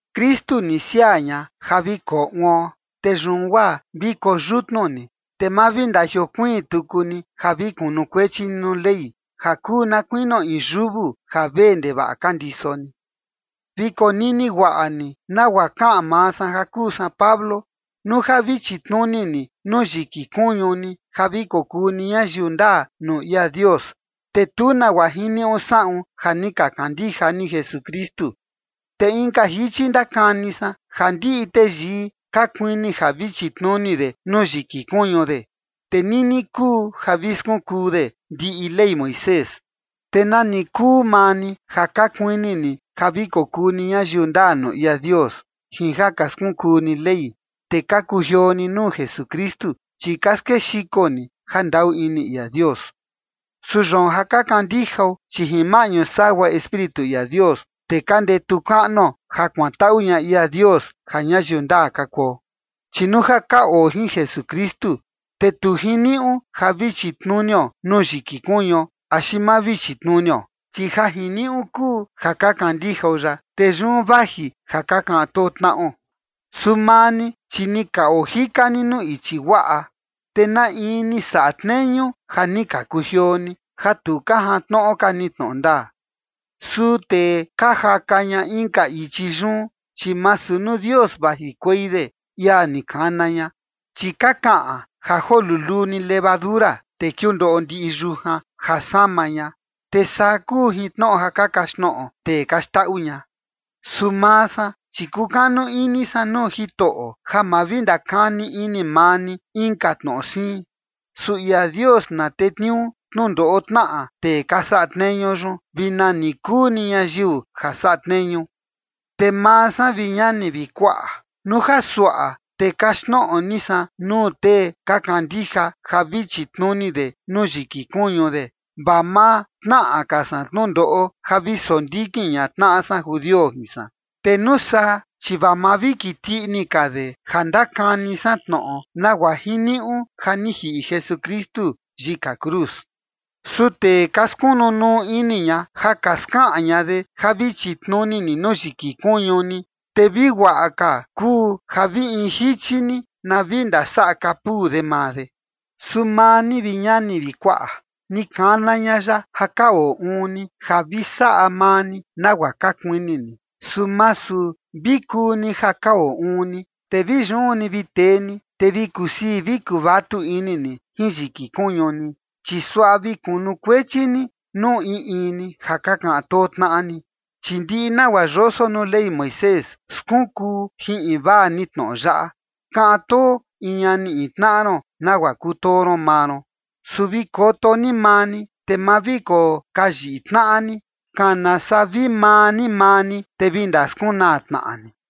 Kristu ni siaa ña ja vi koo uon. Te yun guaa vi koyutnu ni, te ma vi ndajiokuiin tuku ni ja vi kunukuechi ni nuu Ley ja kuu na kuinio in yuvu ja vee ndevaꞌa ka ndiso ni. Vi konini guaꞌa ni nagua kaꞌan maa san ja kuu san Pablo: Nuu ja vi chitnuni ni nuu yiki kuñu ni ja vi kokuu ni ñayiu ndaa nuu ia Dios, te tu nagua jiniuꞌu saꞌun ja ni ka kandija ni Jesukristu. Te inka jichi ndakani san, ja ndiꞌi teyii ka kuini ja vi chitnuni de nuu yiki kuñu de, te nini kuu ja vi skunkuu de ndiꞌi Ley Moisés. Te nani kuu maa ni ja ka kuini ni ja vi kokuu ni ñayiu ndaa nuu ia Dios jin ja ka skunkuu ni Ley, te ka kujioo ni nuu Jesukristu, chi ka skexiko ni jandaꞌu ini ia Dios. Su yoon ja ka kandijao, chi jin maꞌñu sagua Espíritu ia Dios, te ka ndetu kaꞌnuo ja kuantaꞌu ña ia Dios ja ñayiu ndaa ka kuo. Chi nuu ja ka oo jin Jesukristu, te tu jiniuꞌu ja vi chitnunio nuu yiki kuñuo axi ma vi chitnunio. Chi ja jiniuꞌu kuu ja ka kandijao ya, te yun vaji ja ka kaꞌan too tnaꞌo. Su maa ni, chi ni ka ojika ni nuu ichi guaꞌa, ¿te na in ni saꞌa tneñu ja ni ka kujioo ni, ja tu ka jantnoꞌo ka ni tnoꞌo ndaa? Su tee ka jaka ña inka ichi yun, chi masu nuu Dios vajikuei de, ia ni kana ña. Chi ka kaꞌan ja joo luluu ni levadura, te kiundoꞌo ndiꞌi yujan ja sama ña, te saa kuu jin tnoꞌo ja ka kaxtnoꞌo tee ka xndaꞌu ña. Su maa san, chi kukanu ini san nuu Jitoꞌo, ja ma vi ndakani ini maa ni inka tnoꞌo siin. Su ia Dios na tetniuu tnundoꞌo tnaꞌa tee ka saꞌa tneñu yun, vi nani kuu ni ñayiu ja saꞌa tneñu. Te maa san, vi ñani vi kuaꞌa, nuu ja suaꞌa te kaxtnoꞌo ni san nuu tee ka kandija ja vi chitnuni de nuu yiki kuñu de, vaa ma tnaꞌa ka san tnundoꞌo ja vi sondikin ña tnaꞌa san judio jin san. Te nuu saa, chi vaa ma vi kiti ini ka de ja ndakani san tnoꞌo nagua jiniuꞌu ja ni jiꞌi Jesukristu yika cruz. Su tee ka skunu nuu ini ña ja ka skaꞌan ña de ja vi chitnuni ni nuu yiki kuñu ni, te vi guaꞌa ka kuu ja vi in jichi ni na vi ndasaꞌa kapuu de maa de. Su maa ni, vi ñani vi kuaꞌa, ni kana ña ya ja ka oo uun ni ja vi saꞌa maa ni nagua ka kuini ni. Su masu vi kuu ni ja ka oo uun ni, te vi yun ni vi tee ni, te vi kusii vi kuvatu ini ni jin yiki kuñu ni, chi suaꞌa vi kunukuechi ni nuu in in ni ja ka kaꞌan too tnaꞌa ni. Chi ndiꞌi nagua yoso nuu Ley Moisés skunkuu jin invaa ni tnoꞌo yaꞌa: “Kaꞌan too in ñani in tnaꞌa ron nagua kutoo ron maa ron”. Su vi koto ni maa ni, te ma vi kokayiꞌi tnaꞌa ni, kana saa vi maa ni maa ni, te vi ndaskunaa tnaꞌa ni.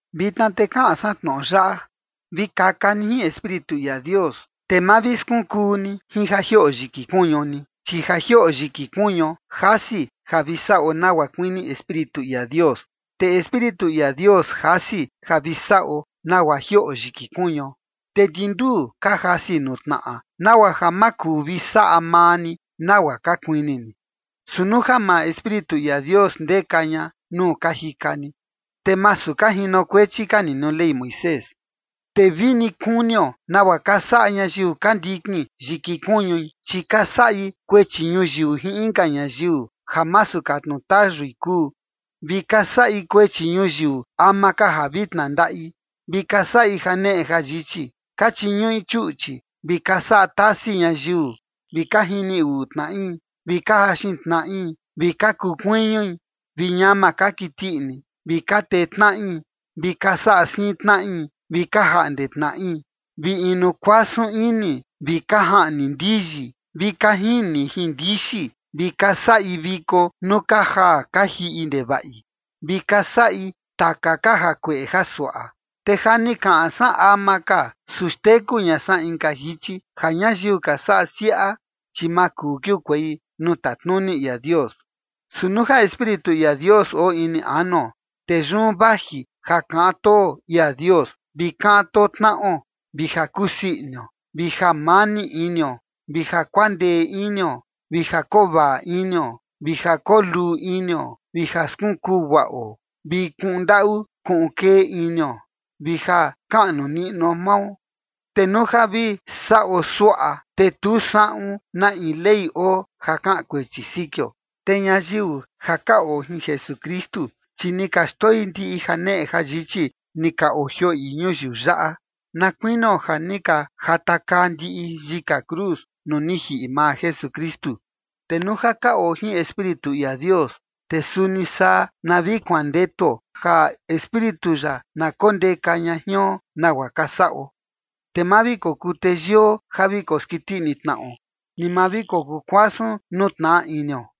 Vitna te kaꞌan san tnoꞌo yaꞌa: Vi kaka ni jin Espíritu ia Dios, te ma vi skunkuu ni jin ja jioꞌo yiki kuñu ni. Chi ja jioꞌo yiki kuñuo, jasi ja vi saꞌo nagua kuini Espíritu ia Dios. Te Espíritu ia Dios jasi ja vi saꞌo nagua jioꞌo yiki kuñuo. Te ndi nduu ka jasi nuu tnaꞌa, nagua ja ma kuu ja vi saꞌa maa ni nagua ka kuini ni. Su nuu ja maa Espíritu ia Dios ndeka ña nuu ka jika ni, te masu ka jinokuechi ka ni nuu Ley Moisés. Te vini kunio nagua ka saꞌa ñayiu ka ndikin yiki kuñui: Chi ka saꞌi kuechi ñuyiu jin inka ñayiu ja masu katnu tayui kuu, vi ka saꞌi kuechi ñuyiu ama ka ja vi tnandaꞌi, vi ka saꞌi janeꞌe jayichi, ka chiñuꞌi chuꞌchi, vi ka saꞌa tasi ñayiu, vi ka jini uꞌui tnaꞌi, vi ka jaxin tnaꞌi, vi ka kuu kuiñui, vi ñama ka kiti ini, vi ka tetnaꞌi, vi ka saꞌa siin tnaꞌi, vi ka jaꞌnde tnaꞌi, vi inu kuasun ini, vi ka jaꞌni ndiyi, vi ka jini jin ndixi, vi ka saꞌi viko nuu ka jaa ka jiꞌi ndevaꞌi, vi ka saꞌi taka ka jakueꞌe jasuaꞌa. Te ja ni kaꞌan san ama ka, su xteku ña san inka jichi, ja ñayiu ka saꞌa siaꞌa, chi ma kuu kiukuei nuu tatnuni ia Dios. Su nuu ja Espíritu ia Dios oo ini anuo, te yun vaji ja kaꞌan too ia Dios vi ka kaꞌan too tnaꞌo, vi ja kusii inio, vi jamani inio, vi ja kuandee inio, vi ja kovaꞌa inio, vi ja koo luu inio, vi ja vi skunkuu guaꞌo, vi kuꞌun ndaꞌu kuꞌun kee inio, vi ja kaꞌnu niꞌnuo mao. Te nuu ja vi saꞌo suaꞌa, te tu saꞌun na in ley oo ja kaꞌan kuechi sikio. Te ñayiu ja ka oo jin Jesukristu, chi ni ka xndoi ndiꞌi janeꞌe jayichi ni ka ojioꞌi ñuyiu yaꞌa, na kuinio ja ni ka jatakaa ndiꞌi yika cruz nuu ni jiꞌi maa Jesukristu. Te nuu ja ka oo jin Espíritu ia Dios, te suni saa na vi kuandetuo ja Espíritu ya na kondeka ña jion nagua ka saꞌo. Te ma vi kokuu teyio, ja vi koskiti ini tnaꞌo, ni ma vi kokuu kuasun nuu tnaꞌa inio.